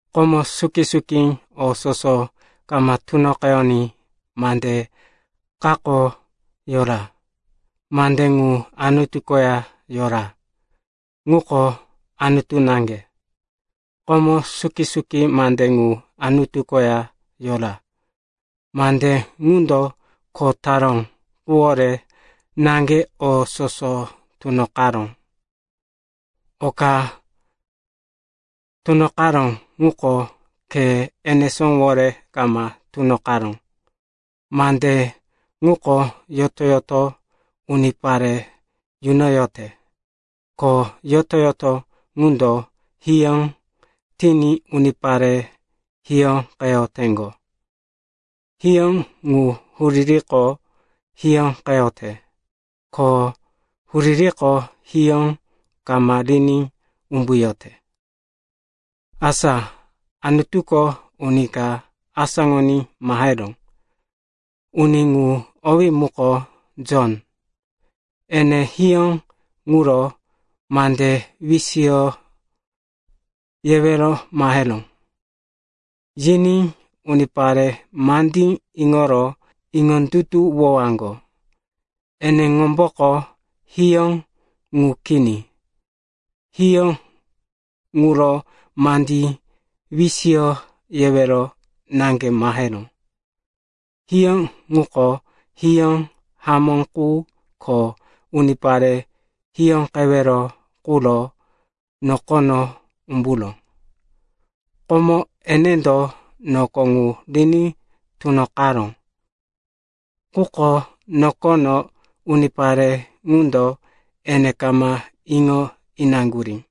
Komo suki-suki, o soso kama tunoqeyoní, Mande kako yora. Mande ŋu Anutu koya yora, ŋuko Anutu naŋge. Komo suki-suki Mande ŋu Anutu koya yora. Mande ŋundo kho taró quwore naŋge o soso tunoqaró. Oka tunoqaró ŋuko khe enesówore kama tunoqaró. Mande ŋuko yoto-yoto unipare yunoyote. Ko yoto-yoto ŋundo hiyó tiní unipare hiyóqeyoteŋgo. Hiyó ŋu huririko hiyóqeyote. Ko huririko hiyó kama riní umbuyote. Asa Anutuko uni ka asáŋoní maheró. Uni ŋu owí muko Jon. Ene hiyó ŋuro mande wisiyo yewero maheró. Yiní unipare mandí iŋoro iŋondutuwowaŋgo. Eneŋomboko hiyó ŋu kini. Hiyó ŋuro mande wisiyo yewero naŋge maheró. Hiyó ŋuko hiyó hamó qu ko unipare hiyóqewero quro nokono umburó. Komo enendo noko ŋu riní tunoqaró. Quko nokono unipare ŋundo ene kama iŋo inaŋgurí.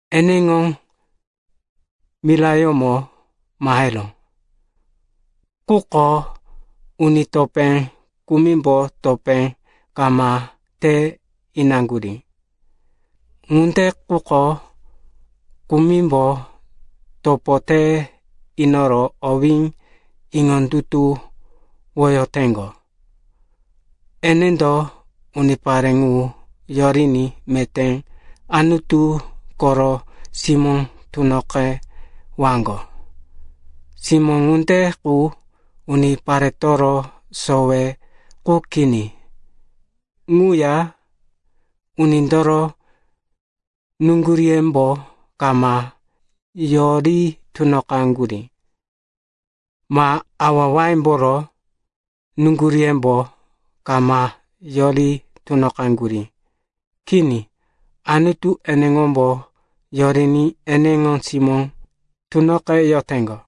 Eneŋo mirayómo maheró, quko uni topé kumimbo topo kama te inaŋgurí. Ŋunde quko kumimbo topo te inoro owí iŋondutuwoyoteŋgo, enendo unipare ŋu yoriní meté Anutu koro simó tunoqewaŋgo. Simó ŋunde qu uniparetoro sowe qu kini. Ŋuya unindoro nuŋguríyembo kama yori tunoqaŋgurí, ma awa-awayemboro nuŋguríyembo kama yori tunoqaŋgurí. Kini, Anutu eneŋombo yoriní eneŋo simó tunoqeyoteŋgo.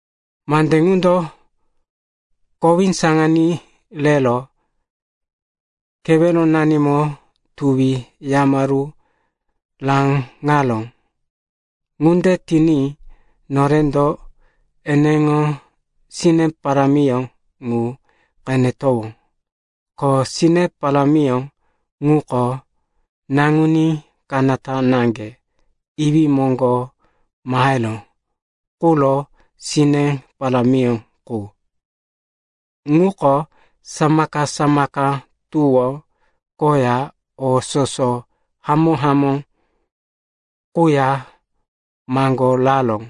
Mande ŋundo kowí saŋaní rero keweronanimo tuwi yamaru raŋaró. Ŋunde tiní norendo eneŋo sine parámiyó ŋu qenetowó, ko sine parámiyó ŋuko Naŋuní Kanata Naŋge Iwí moŋgo maheró quro sine parámiyó qu. Ŋuko samaka-samaka tuwó koya o soso hamó-hamó quya maŋgoraró.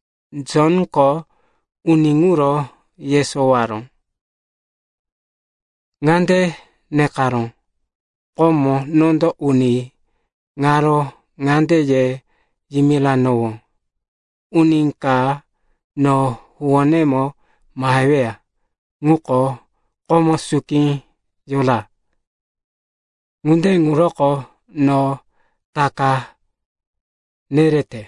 Jonko uni ŋuro yesowaró. Ŋande nekaró, “Komo, nondo uni ŋaro ŋande ye yimiranowó, ‘Uni ka no huwónemo maheweya ŋuko komo suki yora, ŋunde ŋuroko no taka nerete.’”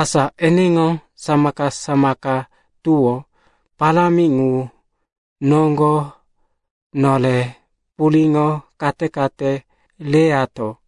Asa eneŋo samaka-samaka tuwó parámi ŋu noŋgo nore puriŋo kate-kate reyato.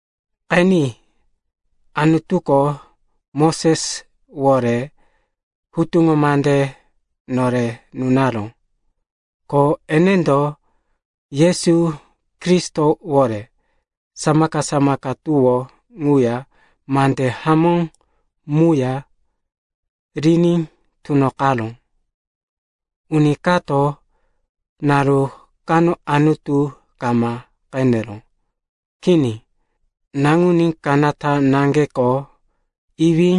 Qeni, Anutuko Moseswore hutuŋo mande nore nunaró. Ko enendo Yesu Kristowore samaka-samaka tuwó ŋuya mande hamó muya riní tunoqaró. Uni kato naru kano Anutu kama qeneró. Kini. Naŋuní Kanata Naŋgeko Iwí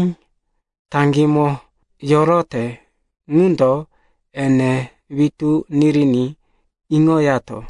taŋgímo yorote ŋundo ene witú niriní iŋoyato.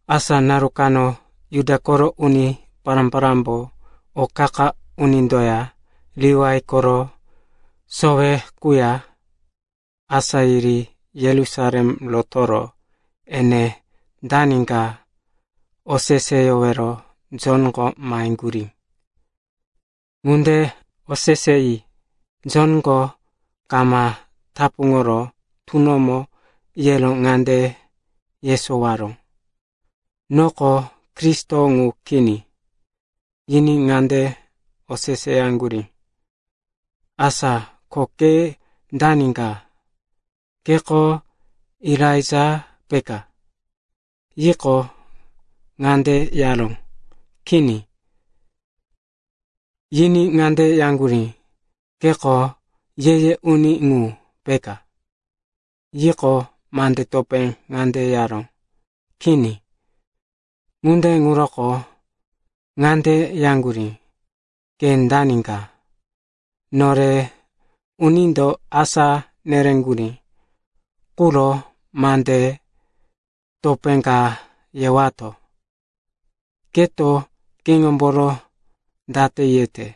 Asa naru kano Juda koro uni pará-parámbo o qa-qa unindoya Liwai koro sowe quya asá yiri Yerusalem rotoro ene dani ka oseseyowero Jonko maheŋgurí. Ŋunde oseseyi Jonko kama tapuŋoro tunomo yero ŋande yesowaró, “Noko Kristo ŋu kini.” Yiní ŋande oseseyaŋgurí, “Asa ko ke dani ka? Keko Elaija peka?” Yiqo, ŋande yaró, “Kini.” Yiní ŋande yaŋgurí, “Keko Ye-ye uni ŋu peka?” Yiqo, mande topé ŋande yaró, “Kini.” Ŋunde ŋuroko ŋande yaŋgurí, “Ke dani ka? Nore unindo asá nereŋgurí quro mande topé ka yewato. Keto keŋomboro date yete?”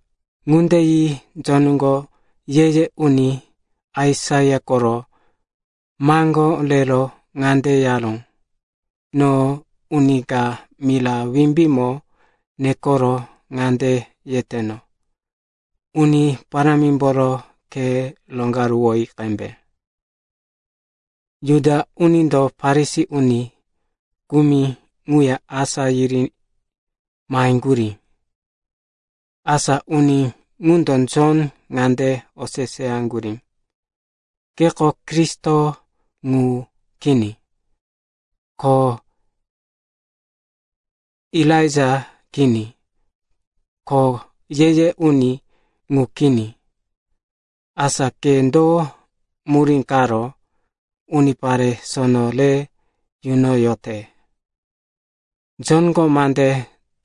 Ŋunde yi Jonko ye-ye uni Aisaia koro maŋgó rero ŋande yaró, “No uni ka mira wimbímo nekoro ŋande yeteno, ‘Uni Parámimboro khe roŋgaruwoyi qembe.’” Juda unindo Farisi uni kumi ŋuya asá yiri maheŋgurí. Asa uni ŋundo Jon ŋande oseseyaŋgurí, “Keko Kristo ŋu kini, ko Elaija kini, ko Ye-ye uni ŋu kini. Asa ke do murí karo unipare sono re yunoyote?” Jonko mande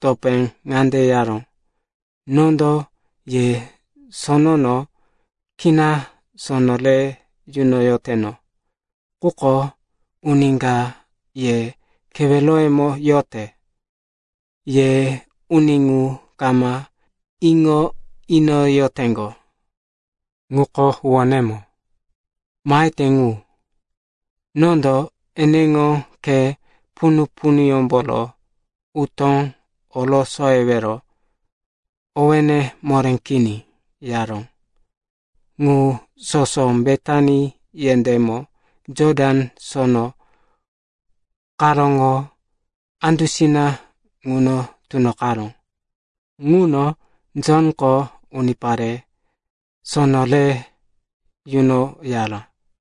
topé ŋande yaró, “Nondo ye sonono kina sono re yunoyoteno. Quko uni ka ye keweroyemo yote, ye uni ŋu kama iŋo inoyoteŋgo. Ŋuko huwónemo mahete ŋu. Nondo eneŋo khe punu-punuyómboro utó orosoyewero owéne moré kini,” yaró. Ŋu soso Betani yendémo Jotan sono karóŋo andusina ŋuno tunoqaró. Ŋuno Jonko unipare sono re yunoyara.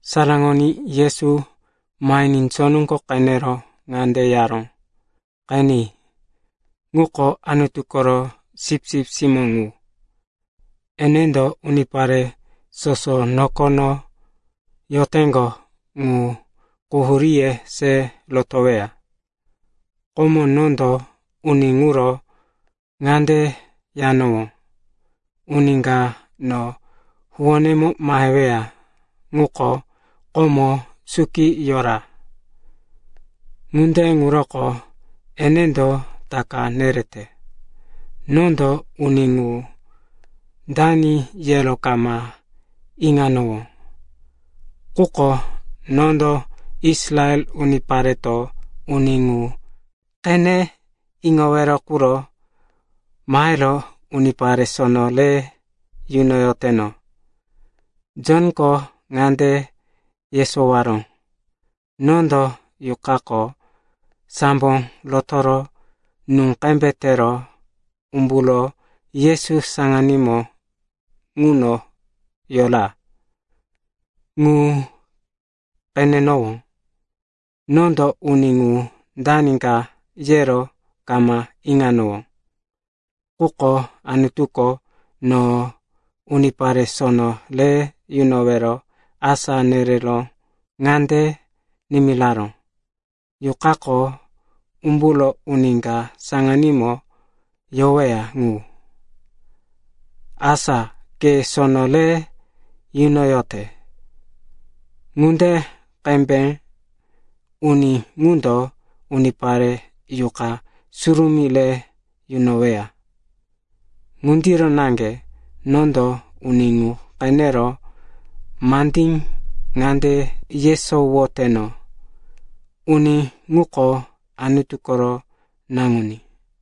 Saraŋoní, Yesu mahiní Jonko qenero ŋande yaró, “Qeni, ŋuko Anutu koro sipsip simó ŋu. Enendo unipare soso nokono yoteŋgo ŋu quhuríye se rotoweya. Komo nondo uni ŋuro ŋande yanowó, ‘Uni ka no huwónemo maheweya ŋuko komo suki yora. Ŋunde ŋuroko enendo taka nerete.’ Nondo uni ŋu dani yero kama iŋanowó. Quko nondo Israel unipareto uni ŋu qene iŋowero quro mahero unipare sono re yunoyoteno.” Jonko ŋande yesowaró, “Nondo Yuqako sambo rotoro nú qembe tero umburo Yesu saŋanímo ŋuno yora, ŋu qenenowó. Nondo uni ŋu dani ka yero kama iŋanowó. Quko Anutuko no unipare sono re yunowero asá nerero ŋande nimiraró, ‘Yuqako umburo uni ka saŋanímo yoweya ŋu, asa ke sono re yunoyote ŋunde qembe uni ŋundo unipare Yuqa Surumí re yunoweya.’ Ŋundiro naŋge nondo uni ŋu qenero mande ŋande yesowoteno, uni ŋuko Anutu koro Naŋuní.”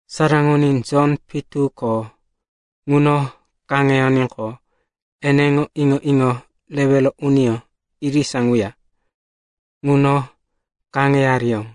Saraŋoní, Jon pitu ko ŋuno kaŋeyoníqo, eneŋo iŋo-iŋo rewero uniyó irisa ŋuya ŋuno kaŋeyariyó.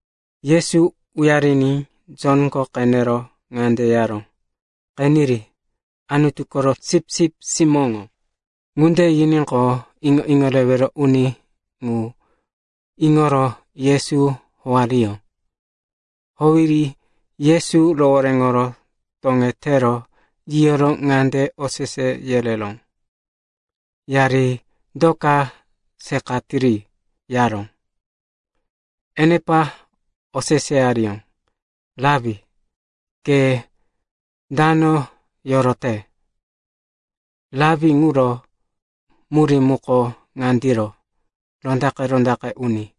Yesu uyariní Jonko qenero ŋande yaró, “Qeniri, Anutu koro Sipsip Simó ŋu.” Ŋunde yiníqo, iŋo-iŋo rewero uni ŋu iŋoro Yesu howariyó. Howiri Yesu rohoréŋoro toŋetero yiyoro ŋande osese yereró, “Yari do ka seqatiri?” yaró. Enepa oseseyariyó, “Rapi, ke dano yorote?” (“Rapi” ŋuro murí muko ŋandiro, “Rondaqe-rondaqe Uni.”)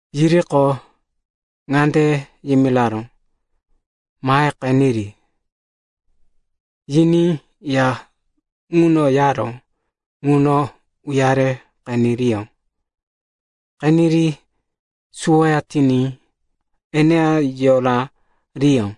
Yiriqo, ŋande yimiraró, “Mahe qeniri.” Yiní ya ŋuno yaró ŋuno uyare qeneriyó. Qeniri suwoya tiní eneya yorariyó.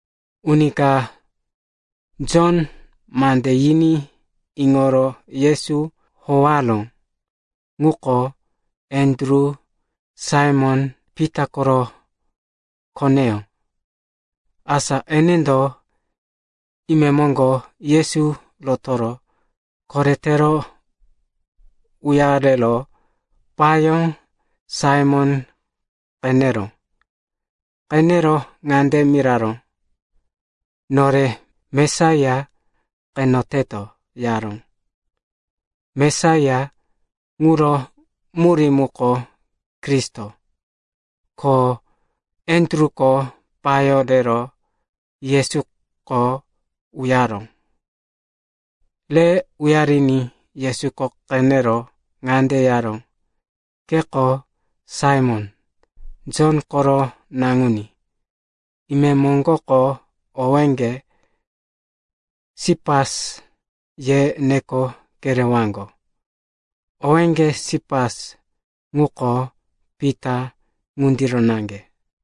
Uni ka Jonko mande yiní iŋoro Yesu howaró ŋuko Andru, Saimon-Pita koro koneyó. Asa enendo imemoŋgo Yesu rotoro koretero uyaro payó Saimon qeneró. Qenero ŋande miraró, “Nore Mesaiya qeneteto,” yaró. (“Mesaiya” ŋuro murí muko “Kristo.”) Ko Andruko payó rero Yesuko uyaró. Re uyariní Yesuko qenero ŋande yaró, “Keko Saimon, Jon koro naŋuní. Imemoŋgoko owéŋge, ‘Sipas,’ ye neko kerewaŋgo.” (Owé “Sipas” ŋuko “Pita” ŋundiro naŋge.)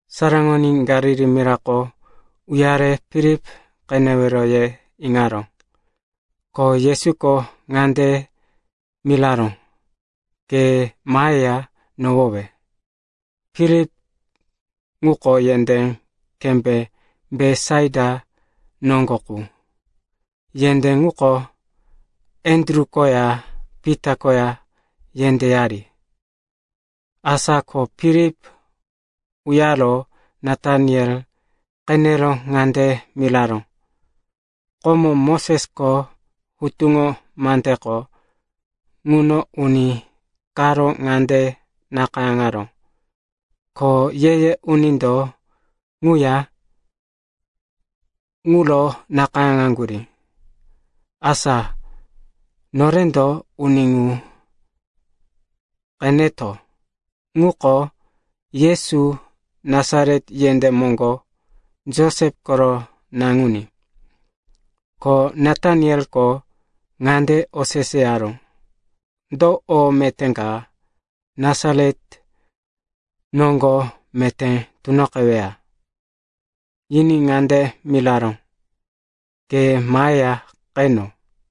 Saraŋoní, Galili mirako uyare Filip qenewero ye iŋaró. Ko Yesuko ŋande miraró, “Ke maheya nohowe.” Filip ŋuko yendé kembé Betisaita noŋgo qu, yendé ŋuko Andru koya Pita koya yendéyari. Asa ko Filip uyaro Nataniel qenero ŋande miraró, “Komo Mosesko hutuŋo mandeko ŋuno uni karo ŋande nakayáŋaró, ko ye-ye unindo ŋuya ŋuro nakayáŋaŋgurí. Asa norendo uni ŋu qeneto. Ŋuko Yesu Nasaret yendé moŋgo, Josep koro naŋuní.” Ko Natanieliko ŋande oseseyaró, “Do o meté ka Nasaret noŋgo meté tunoqeweya?” Yiní ŋande miraró, “Ke maheya qeno.”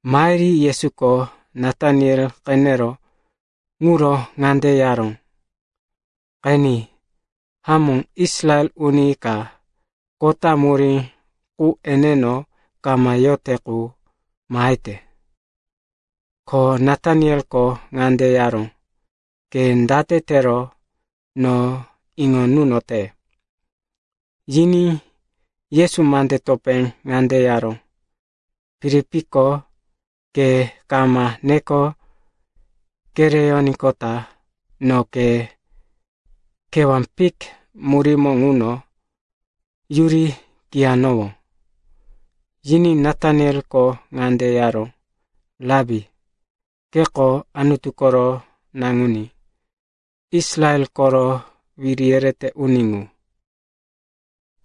Mahiri Yesuko Nataniel qenero ŋuro ŋande yaró, “Qeni. Hamó Israel uni ka kota murí qu eneno kama yote qu mahete.” Ko Natanieliko ŋande yaró, “Ke date tero no iŋo nunote?” Yiní Yesu mande topé ŋande yaró, “Filipko ke kama neko kereyoníqota no ke kewá fik murímo ŋuno yuri kiyanowó.” Yiní Natanieliko ŋande yaró, “Rapi, keko Anutu koro Naŋuní, Israel koro wiri yerete uni ŋu.”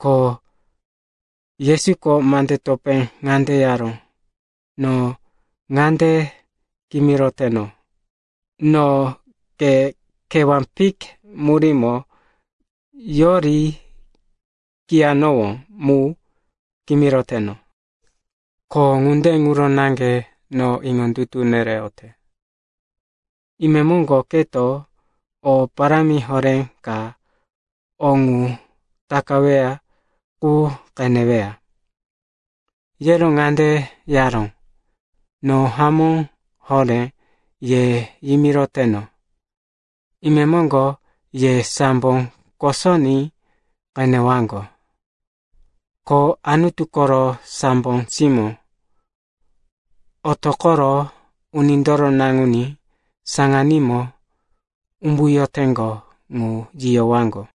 Ko Yesuko mande topé ŋande yaró, “No ŋande kimiroteno, no ke kewá fik murímo yori kiyanowó mu kimiroteno, ko ŋunde ŋuro naŋge no iŋondutu nereyote. Imemoŋgo keto o parámi horé ka o ŋu takaweya qu qeneweya.” Yero ŋande yaró, “No hamó horé ye yimiroteno, imemoŋgo ye sambo kosoní qenewaŋgo, ko Anutu koro sambo simó otoqoro Unindoro Naŋuní saŋanímo umbuyoteŋgo ŋu yiyowaŋgo.”